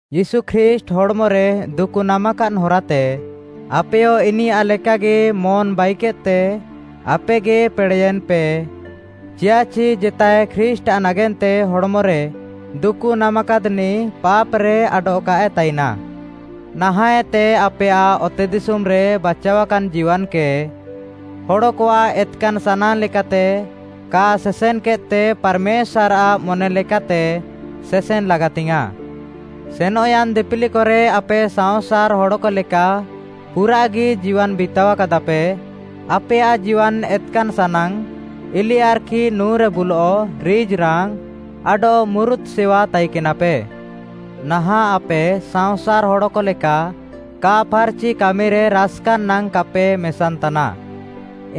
ୟୀଶୁ ଖ୍ରୀଷ୍ଟ୍‌ ହଡ଼୍‌ମରେ ଦୁକୁ ନାମାକାଦ୍‌ ହରାତେ, ଆପେୟ ଇନିୟାଃ ଲେକାଗି ମନ୍‌ ବାଇକେଦ୍‌ତେ ଆପେଗି ପେଡ଼େୟେନ୍‌ପେ, ଚିୟାଃଚି ଜେତାଏ ଖ୍ରୀଷ୍ଟ୍‌ଆଃ ନାଗେନ୍ତେ ହଡ଼୍‌ମରେ ଦୁକୁ ନାମାକାଦ୍‌ନିଃ ପାପ୍‌ରେ ଆଡଃ କାଏ ତାଇନାଃ। ନାହାଁଃଏତେ ଆପେୟାଃ ଅତେଦିଶୁମ୍‌ରେ ବାଚାଅକାନ୍‌ ଜୀୱାନ୍‌କେ ହଡ଼କଆଃ ଏତ୍‌କାନ୍‌ ସାନାଙ୍ଗ୍‌ ଲେକାତେ କା ସେସେନ୍‌କେଦ୍‌ତେ ପାର୍‌ମେଶ୍ୱାର୍‌ଆଃ ମନେଲେକାତେ ସେସେନ୍‌ ଲାଗାତିଙ୍ଗ୍‌ୟାଁଃ। ସେନଃୟାନ୍‌ ଦିପିଲିକରେ ଆପେ ସାଅଁସାର୍‌ ହଡ଼କଲେକା ପୁରାଃଗି ଜୀୱାନ୍‌ ବିତାଅକାଦାପେ। ଆପେୟାଃ ଜୀୱାନ୍‌ ଏତ୍‌କାନ୍‌ ସାନାଙ୍ଗ୍‌, ଇଲିଆର୍‌ଖି ନୁଁରେ ବୁଲଃ, ରିଜ୍‌ରାଙ୍ଗ୍‌, ଆଡଃ ମୁରୁତ୍‌ ସେୱା ତାଇକେନାପେ। ନାହାଁଃ ଆପେ ସାଅଁସାର୍‌ ହଡ଼କ ଲେକା କା ଫାର୍‌ଚି କାମିରେ ରାସ୍‌କାନ୍‌ ନାଙ୍ଗ୍‌ କାପେ ମେସାନ୍‌ତାନା,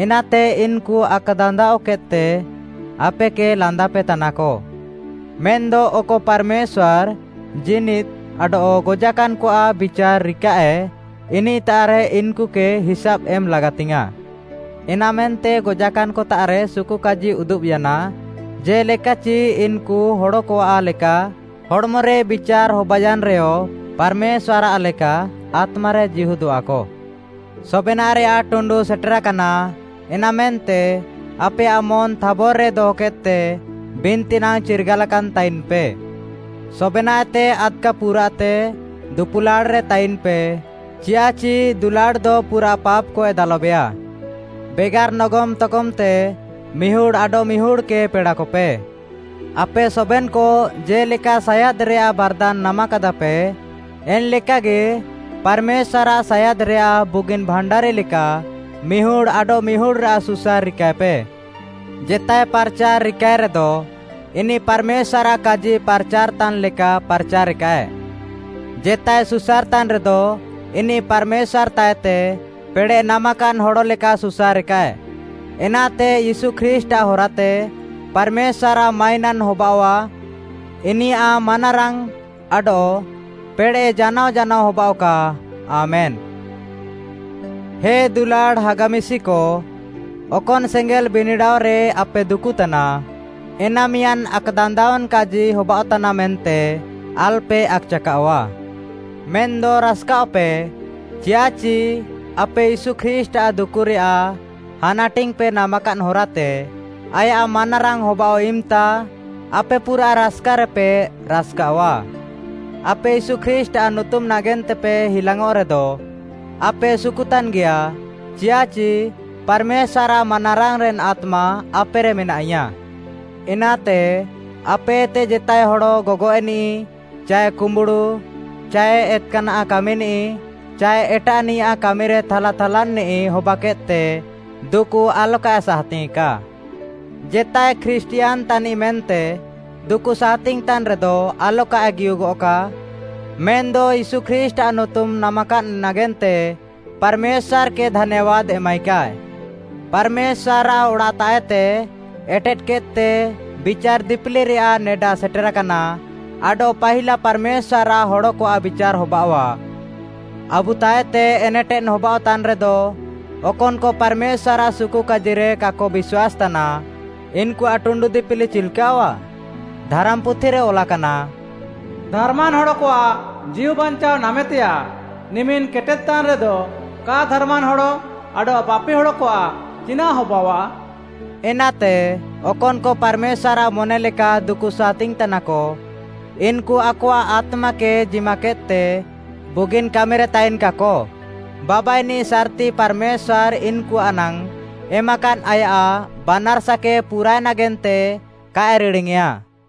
ଏନାତେ ଇନ୍‌କୁ ଆକ୍‌ଦାନ୍ଦାଅକେଦ୍‌ତେ ଆପେକେ ଲାନ୍ଦାପେ ତାନାକ। ମେନ୍‌ଦ ଅକ ପାର୍‌ମେଶ୍ୱାର୍‌ ଜୀନିଦ୍‌ ଆଡଃ ଗଜାକାନ୍‌କଆଃ ବିଚାର୍‌ ରିକାଃଏ, ଇନିଃତାଃରେ ଇନ୍‌କୁକେ ହିସାବ୍‌ ଏମ୍‌ ଲାଗାତିଙ୍ଗ୍‌ୟାଁଃ। ଏନାମେନ୍ତେ ଗଜାକାନ୍‌କତାଃରେ ସୁକୁକାଜି ଉଦୁବ୍‌ୟାନା, ଜେ'ଲେକାଚି ଇନ୍‌କୁ ହଡ଼କଆଃ ଲେକା ହଡ଼୍‌ମରେ ବିଚାର୍‌ ହବାନ୍‌ୟାନ୍‌ରେୟ, ପାର୍‌ମେଶ୍ୱାର୍‌ଆଃ ଲେକା ଆତ୍ମାରେ ଜୀହୁଦଃଆକ। ସବେନାଃରେୟାଃ ଟୁଣ୍ଡୁ ସେଟେରାକାନା। ଏନାମେନ୍ତେ ଆପେୟାଃ ମନ୍‌ ଥାବର୍‌ରେ ଦହକେଦ୍‌ତେ, ବିନ୍ତି ନାଙ୍ଗ୍‌ ଚିର୍ଗାଲାକାନ୍‌ ତାଇନ୍‌ପେ। ସବେନାଃଏତେ ଆଦ୍‌କା ପୁରାଃତେ ଦୁପୁଲାଡ଼୍‌ରେ ତାଇନ୍‌ପେ, ଚିୟାଃଚି ଦୁଲାଡ଼୍‌ଦ ପୁରାଃ ପାପ୍‌କଏ ଦାଲବେଆ। ବେଗାର୍‌ ନଗମ୍‌ ତଗମ୍‌ତେ ମିହୁଡ଼୍‌ ଆଡଃମିହୁଡ଼୍‌କେ ପେଡ଼ାକପେ। ଆପେ ସବେନ୍‌କ ଜେ'ଲେକା ସାୟାଦ୍‌ରେୟାଃ ବାର୍‌ଦାନ୍‌ ନାମାକାଦାପେ, ଏନ୍‌ଲେକାଗି ପାର୍‌ମେଶ୍ୱାର୍‌ଆଃ ସାୟାଦ୍‌ରେୟାଃ ବୁଗିନ୍‌ ଭାଣ୍ଡାରି ଲେକା ମିହୁଡ଼୍‌ ଆଡଃମିହୁଡ଼୍‌ରାଃ ସୁସାର୍‌ ରିକାଏପେ। ଜେତାଏ ପାର୍‌ଚାର୍‌ ରିକାଏରେଦ, ଇନିଃ ପାର୍‌ମେଶ୍ୱାର୍‌ଆଃ କାଜି ପାର୍‌ଚାର୍‌ତାନ୍‌ ଲେକା ପାର୍‌ଚାରେକାଏ। ଜେତାଏ ସୁସାର୍‌ତାନ୍‌ରେଦ ଇନିଃ ପାର୍‌ମେଶ୍ୱାର୍‌ତାଃଏତେ ପେଡ଼େଃ ନାମାକାଦ୍‌ ହଡ଼ଲେକା ସୁସାରେକାଏ। ଏନାତେ ୟୀଶୁ ଖ୍ରୀଷ୍ଟ୍‌ଆଃ ହରାତେ ପାର୍‌ମେଶ୍ୱାର୍‌ଆଃ ମାଇନାନ୍‌ ହବାଅଆଃ। ଇନିୟାଃ ମାନାରାଙ୍ଗ୍‌ ଆଡଃ ପେଡ଼େଃ ଜାନାଅ ଜାନାଅ ହବାଅଃକା। ଆମେନ୍‌। ହେ ଦୁଲାଡ଼୍‌ ହାଗା ମିଶିକ, ଅକନ୍‌ ସେଙ୍ଗେଲ୍‌ ବିନିଡ଼ାଅରେ ଆପେ ଦୁକୁଃତାନା, ଏନା ମିଆଁଦ୍‌ ଆକ୍‌ଦାନ୍ଦାଅନ୍‌ କାଜି ହବାଅଃତାନା ମେନ୍ତେ ଆଲ୍‌ପେ ଆକ୍‌ଚାକାଅଃଆ। ମେନ୍‌ଦ ରାସ୍‌କାଅଃପେ, ଚିୟାଃଚି ଆପେ ୟୀଶୁ ଖ୍ରୀଷ୍ଟ୍‌ଆଃ ଦୁକୁରେୟାଃ ହାନାଟିଙ୍ଗ୍‌ପେ ନାମାକାଦ୍‌ ହରାତେ ଆୟାଃ ମାନାରାଙ୍ଗ୍‌ ହବାଅଃ ଇମ୍‌ତା ଆପେ ପୁରାଃ ରାସ୍‌କାରେପେ ରାସ୍‌କାଅଃଆ। ଆପେ ୟୀଶୁ ଖ୍ରୀଷ୍ଟ୍‌ଆଃ ନୁତୁମ୍‌ ନାଗେନ୍ତେପେ ହିଲାଙ୍ଗ୍‌ଅଃରେଦ, ଆପେ ସୁକୁତାନ୍‌ଗିଆ, ଚିୟାଃଚି ପାର୍‌ମେଶ୍ୱାର୍‌ଆଃ ମାନାରାଙ୍ଗ୍‌ରେନ୍‌ ଆତ୍ମା ଆପେରେ ମେନାଇୟା। ଏନାତେ ଆପେଏତେ ଜେତାଏ ହଡ଼ ଗଗଏଃନିଃ ଚାଏ କୁମ୍ବୁଡ଼ୁ ଚାଏ ଏତ୍‌କାନାଃ କାମିନିଃ ଚାଏ ଏଟାଃନିଆଃ କାମିରେ ଥାଲାଥାଲାନ୍‌ନିଃ ହବାକେଦ୍‌ତେ ଦୁକୁ ଆଲକାଏ ସାହାତିଙ୍ଗ୍‌ୟେଁକା। ଜେତାଏ ଖ୍ରୀଷ୍ଟିୟାନ୍‌ ତାନିଃ ମେନ୍ତେ ଦୁକୁ ସାହାତିଙ୍ଗ୍‌ ତାନ୍‌ରେଦ ଆଲକାଏ ଗିହୁଗଃକା, ମେନ୍‌ଦ ୟୀଶୁ ଖ୍ରୀଷ୍ଟ୍‌ଆଃ ନୁତୁମ୍‌ ନାମାକାଦ୍‌ ନାଗେନ୍ତେ ପାର୍‌ମେଶ୍ୱାର୍‌କେ ଧାନ୍ୟାବାଦ୍‌ ଏମାଇକାଏ। ପାର୍‌ମେଶ୍ୱାର୍‌ଆଃ ଅଡ଼ାଃତାଃଏତେ ଏଟେଦ୍‌କେଦ୍‌ତେ ବିଚାର୍‌ ଦିପିଲିରେୟାଃ ନେଡା ସେଟେରାକାନା, ଆଡଃ ପାହିଲା ପାର୍‌ମେଶ୍ୱାର୍‌ଆଃ ହଡ଼କଆଃ ବିଚାର୍‌ ହବାଅଃଆ। ଆବୁତାଃଏତେ ଏନେଟେଦ୍‌ ହବାଅଃତାନ୍‌ରେଦ, ଅକନ୍‌କ ପାର୍‌ମେଶ୍ୱାର୍‌ଆଃ ସୁକୁକାଜିରେ କାକ ବିଶ୍ୱାସ୍‌ତାନା, ଇନ୍‌କୁଆଃ ଟୁଣ୍ଡୁ ଦିପିଲି ଚିଲ୍‌କାଅଃଆ? ଧାରାମ୍‌ପୁଥିରେ ଅଲାକାନା, “ଧାର୍‌ମାନ୍‌ ହଡ଼କଆଃ ଜୀଉବାଞ୍ଚାଅ ନାମେତେୟାଃ ନିମିନ୍‌ କେଟେଦ୍‌ତାନ୍‌ରେଦ, କା ଧାର୍‌ମାନ୍‌ ହଡ଼ ଆଡଃ ପାପି ହଡ଼କଆଃ ଚିନାଃ ହବାଅଃଆ?” ଏନାତେ, ଅକନ୍‌କ ପାର୍‌ମେଶ୍ୱାର୍‌ଆଃ ମନେଲେକା ଦୁକୁ ସାହାତିଙ୍ଗ୍‌ତାନାକ, ଇନ୍‌କୁ ଆକଆଃ ଆତ୍ମାକେ ଜିମାକେଦ୍‌ତେ ବୁଗିନ୍‌ କାମିରେ ତାଇନ୍‌କାକ। ବାବାଇନିଃ ସାର୍‍ତି ପାର୍‌ମେଶ୍ୱାର୍‌ ଇନ୍‌କୁଆଃ ନାଙ୍ଗ୍‌ ଏମାକାଦ୍‌ ଆୟାଃ ବାନାର୍‌ସାକେ ପୁରାଏ ନାଗେନ୍ତେ କାଏ ରିଡ଼ିଙ୍ଗ୍‌ୟେଁଆ।